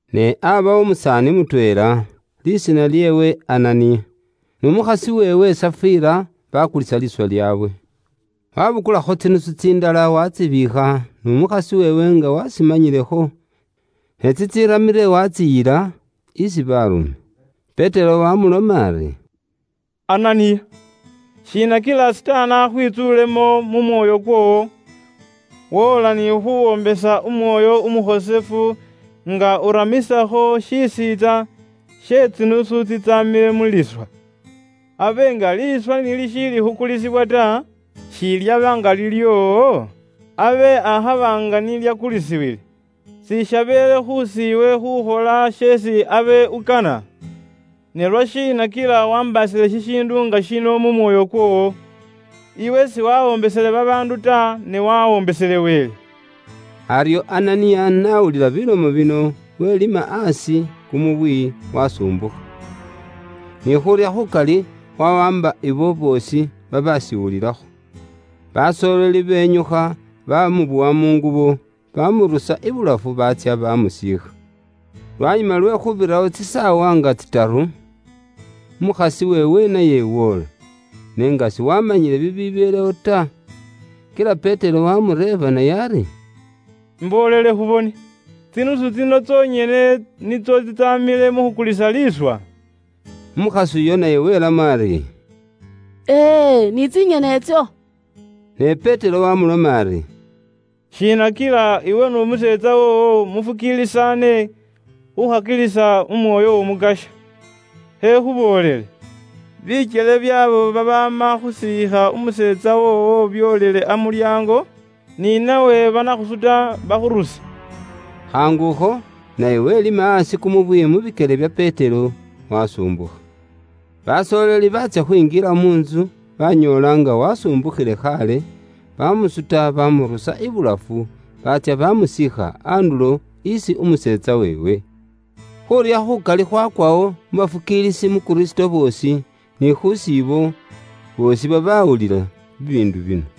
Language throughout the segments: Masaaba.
Ne aabawo umusaani mutweela, lisiina lyeewe Ananiya, n'umukhasi weewe Safira, baakulisa liiswa lyaabwe. Waabukulakho tsinusu tsindala waatsibiikha, n'umukhasi weewe nga waashimanyilekho, ne tsitsiramile waatsiyila isi baarume. Petero waamuloma ari, “Ananiya, shiina kila Sitaani akhwitsuulemo mu mwoyo kwoowo woola ni khuwoombesa Umwoyo Umukhosefu nga uramisakho shisiintsa she tsinusu tsitsamile mu liiswa? Abe nga liiswa ni lishiili khukulisibwa ta, shilyaba nga lilyoowo? Abe akhaba nga ni lyaakulisibwile, sishabeele khuusi iwe khukhola sheesi abe ukana? Ne lwashiina kila waambaasile shishiindu nga shino mu mwoyo kwoowo? Iwe siwawoombesele babaandu ta, ne wawoombesele Wele.” Aryo Ananiya nga n'awulila bilomo bino, welima aasi kumubwi, wasumbukha. Ni khuurya khukali khwawaamba ibo boosi babashiwulilakho. Basooleli benyukha bamubowa mu ngubo, bamurusa ibulafu baatsya bamusiikha. Lwanyuma lwe khuubirawo tsisaawa nga tsitaru, umukhasi weewe naye woola, n'enga siwaamanyile bibibeelewo ta. Kila Petero waamureeba naye ari, “Imboolele khubone, tsinusu tsino tsonyene nitso tsitsaamile mu khukulisa liiswa?” Umukhasi uyo naye welamo ari, “E e, ni tsinyene itso.” Ne Petero wamuloma ari, “Shiina kila iwe n'umuseetsa woowo mufukiilisaane khukhakilisa Umwoyo w'Omukasya? Khekhuboolele, bikyele byaabo babaama khusiikha umuseetsa woowo byoolile amulyaango, ni nawe banakhusuta bakhuruse.” Khaangukho, naye welima aasi kumubwi mu bikyele bya Petero, wasumbukha. Basooleli baatsya khwinjila mu ntsu banyoola nga wasumbukhile khaale, bamusuta bamurusa ibulafu, baatsya bamusiikha andulo isi umuseetsa weewe. Khuurya khukali khwakwawo mu bafukiilisi mu Kristo boosi, ni khuusi ibo boosi babaawulila bibiindu bino.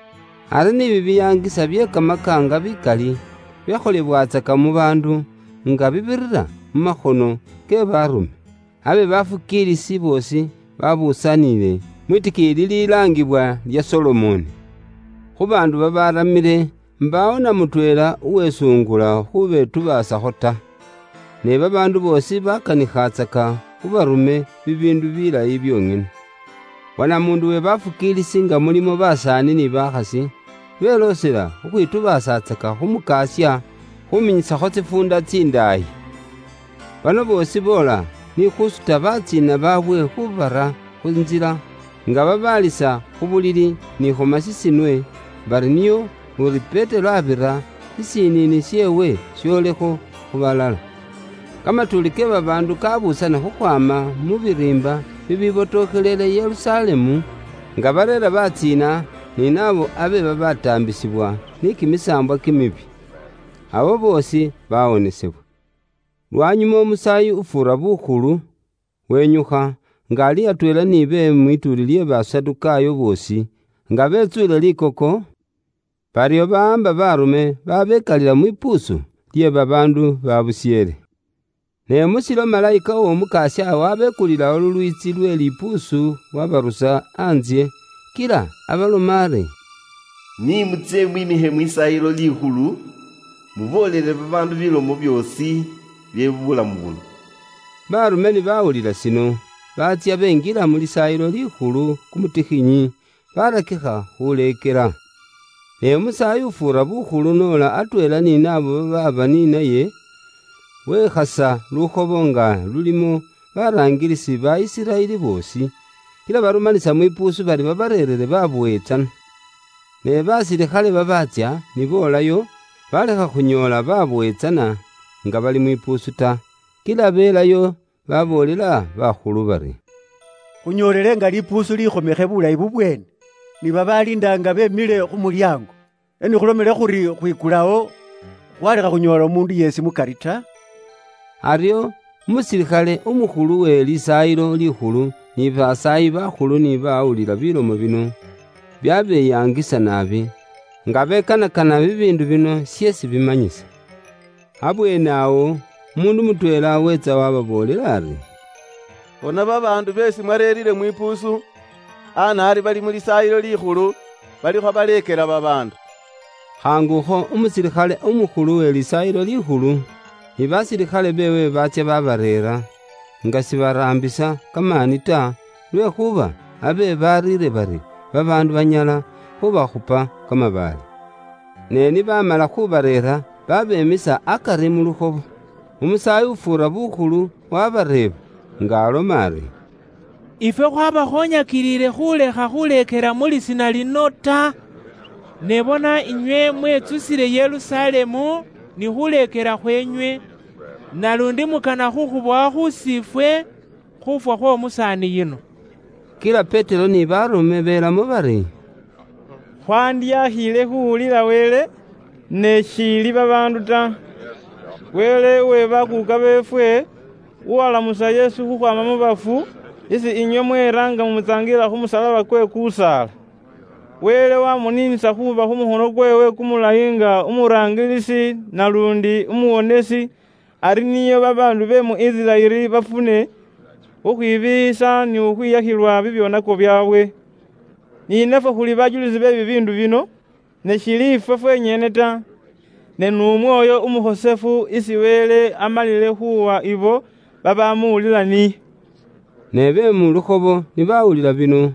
Ari bibiyaangisa ni bye kamakaanga bikali, byakholebwatsaka mu baandu, nga bibirira mu makhono ke baarume. Abe bafukiilisi boosi babusaanile mwitikiiyi lililaangibwa lya Solomoni. Khu baandu babaramile, mbaawo na mutweela uwe sungula khubetubaasakho ta. Ne babaandu boosi bakanikhatsaka khu baarume bibiindu bilayi byonyene. Wanamuundu we bafukiilisi nga mulimo basaani ni bakhasi, beloosela khukhwitubaasatsaka khu Mukasya, khuminyisakho tsifuunda tsindaayi. Bano boosi boola ni khusuta batsiina baabwe khubara khu ntsila, nga babaalisa khu bulili ni khu masisinwe, bari nio uri Petero abira, shishiniini sheewe sholekho khu balala. Kamatuuli ke babaandu kabuusana khukhwaama mu biriimba bibibotokhelele Yerusalemu, nga bareera batsiina ni naabo abe babataambisibwa ni kimisaambwa kimibi. Abo boosi bawonesebwa. Lwanyuma Umusaayi ufuura bukhulu wenyukha, nga ali atweela ni be mwituuli lye Basadukaayo boosi, nga betsuule likoko, baryo bawaamba baarume baabekalila mwipuusu lye babaandu baabusheele. Ne mu shilo malayika w'Omukasya waabekulilawo lulwiitsi lwe lipuusu waabarusa antsye, kila abaloma ari, “Ni mutsye mwiimikhe mu Lisaayilo Likhulu, muboolele babaandu bilomo byoosi bye buulamu buno.” Baarume ni baawulila shino, baatsya benjila mu Lisaayilo Likhulu kumutikhinyi, baarakikha khuuleekela. Ne Umusaayi ufuura bukhulu n'ola, atweela ni naabo babaaba ni naye, wekhasa lukhobo nga lulimo baraangilisi ba Isiraeli boosi. Kila barumanisa mwipuusu bari babareerere babowe tsana. Ne basilikhale babaatsya ni boolayo, baalekha khunyoola babowe tsana nga bali mwipuusu ta. Kila belayo baboolela bakhulu bari, “Khunyoolele nga lipuusu likhomekhe bulayi bubweene, ni babaaliinda nga beemile khu mulyaango, ne ni khulomile khuri khwikulawo, khwalekha khunyoola umuundu yeesi mukari ta.” Aryo umusilikhale umukhulu uwe Lisaayilo Likhulu ni basaayi bakhulu ni baawulila bilomo bino, byabeyangisa naabi, nga bekanakana byeesi bibiindu bino sheesi bimanyisa. Abweenewo, umuundu mutweela weetsa waababoolela ari, “Bona babaandu beesi mwareere mwipuusu anaari bali mu Lisaayilo Likhulu balikho baleekela babaandu.” Khaangukho umusilikhale umukhulu we Lisaayilo Likhulu, ni basilikhale beewe baatsya babareera, nga sibaraambisa kamaani ta, lwekhuuba abe bariire bari babaandu banyala khubakhupa kamabaale. Ne ni baamala khubareera, baabeemisa akari mu lukhobo. Umusaayi ufuura bukhulu wabareeba, nga aloma ari, “Ifwe khwabakhoonyakilile khuulekha khuleekela mu Lisiina lino ta. Ne bona inywe mwetsusile Yerusalemu ni khuleekela khweenywe, naluundi mukana khukhubowa khuusi ifwe khuufwa khw'omusaani yuno.” Kila Petero ni baarume belamo bari, “Khwandyakhiile khuuwulila Wele, ne shiili babaandu ta. Wele uwe bakuuka beefwe uwalamusa Yesu khukhwaama mu bafu, isi inywe mweera nga mumutsaangilila khu musalaba kwe kusaala. Wele waamuniinisa khuuba khu mukhono kweewe kumulayi nga umuraangilisi naluundi Umuwonesi, ari nio babaandu be mu Isiraeli bafune khukhwibiiyisa ni khukhwiyakhilwa bibyoonako byaabwe. Ni nafwe khuli bajulisi be bibiindu bino, ne shiili ifwe fwenyene ta, ne n'Umwoyo Umukhosefu isi Wele amalile khuuwa ibo babamuwulila niye.” Ne be mu lukhobo ni bawulila bino,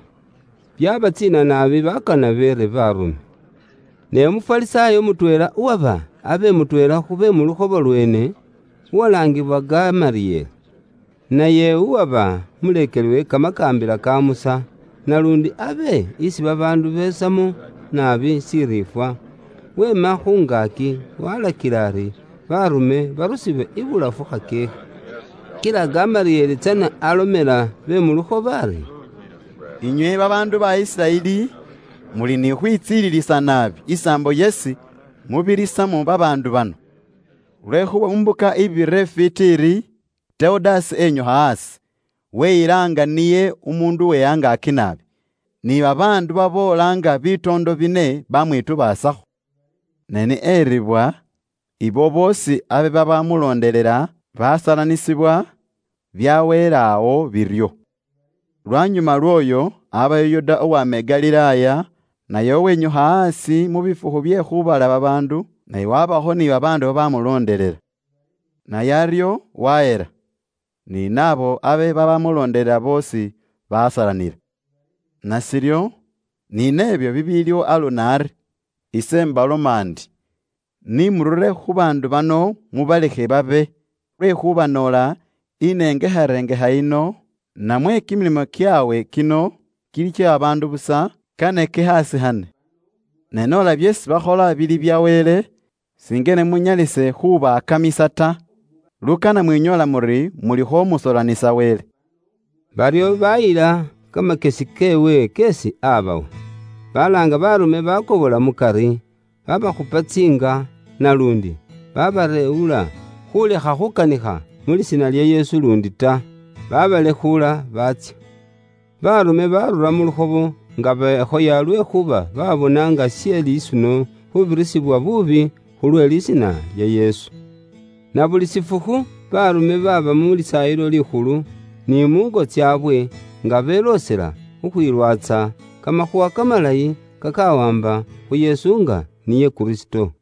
byabatsiina naabi bakana beere baarume. Ne Umufarisaayo mutweela, uwaba abe mutweela khube mu lukhobo lweene, uwalaangiwa Gamalieli, naye uwaba umuleekeli we kamakaambila ka Musa, naluundi abe isi babaandu besamo naabi shiriifwa, weema khu ngaaki, walakila ari baarume barusiwe ibulafu khakyeekhe. Kila Gamalieli tsana alomela be mu lukhobo ari, “Inywe babaandu ba Isiraeli, muli ni khukhwitsililisa naabi isaambo yeesi mubirisamo babaandu bano. Lwekhuuba mu mbuka ibirire ifwiiti iri, Tewudasi enyukha aasi, weyila nga niye umuundu we angaaki naabi. Ni babaandu baboola nga bitoondo bine bamwitubaasakho. Ne ni eribwa, ibo boosi abe babamuloondelela, basalanisibwa, byaweela awo biryo. Lwanyuma lwooyo aabawo Yuda uwama i Galilaaya, naye uwenyukha aasi mu bifukhu bye khuubala babaandu naye wabakho ni babaandu babamuloondelela. Naye aryo wahela, ni naabo abe babamuloondelela boosi basalanila. Nashiryo, ni nebyo bibiiliwo aluno ari ise imbaloma ndi, ni murure khu baandu bano mubalekhe babe. Lwekhuuba noola inengekharengekha yino, namwe kimilimo kyaabwe kino kili kye babaandu busa, kane kikhaasikhane. Ne noola byeesi bakhola bya Wele, singene munyalise khubaakamisa ta. Lukana mwinyoola muri mulikho musoolanisa Wele.” Baryo baayila kamakyesi keewe keesi aabawa. Balaanga baarume baakobola mukari, baabakhupa tsiinga, naluundi baabareewula khuulekha khukanikha mu Lisiina lya Yesu luundi ta. Baabalekhuula baatsya. Baarume baarura mu lukhobo, nga bekhoya lwekhuuba baabona nga she lisuno khuubirisibwa buubi khulwe Lisiina lya Yesu. Na buli shifukhu Baarume baaba mu Lisaayilo Likhulu ni muungo tsaabwe nga beloosela khukhwilwatsa Kamakhuuwa Kamalayi kakawaamba khu Yesu nga niye Kristo.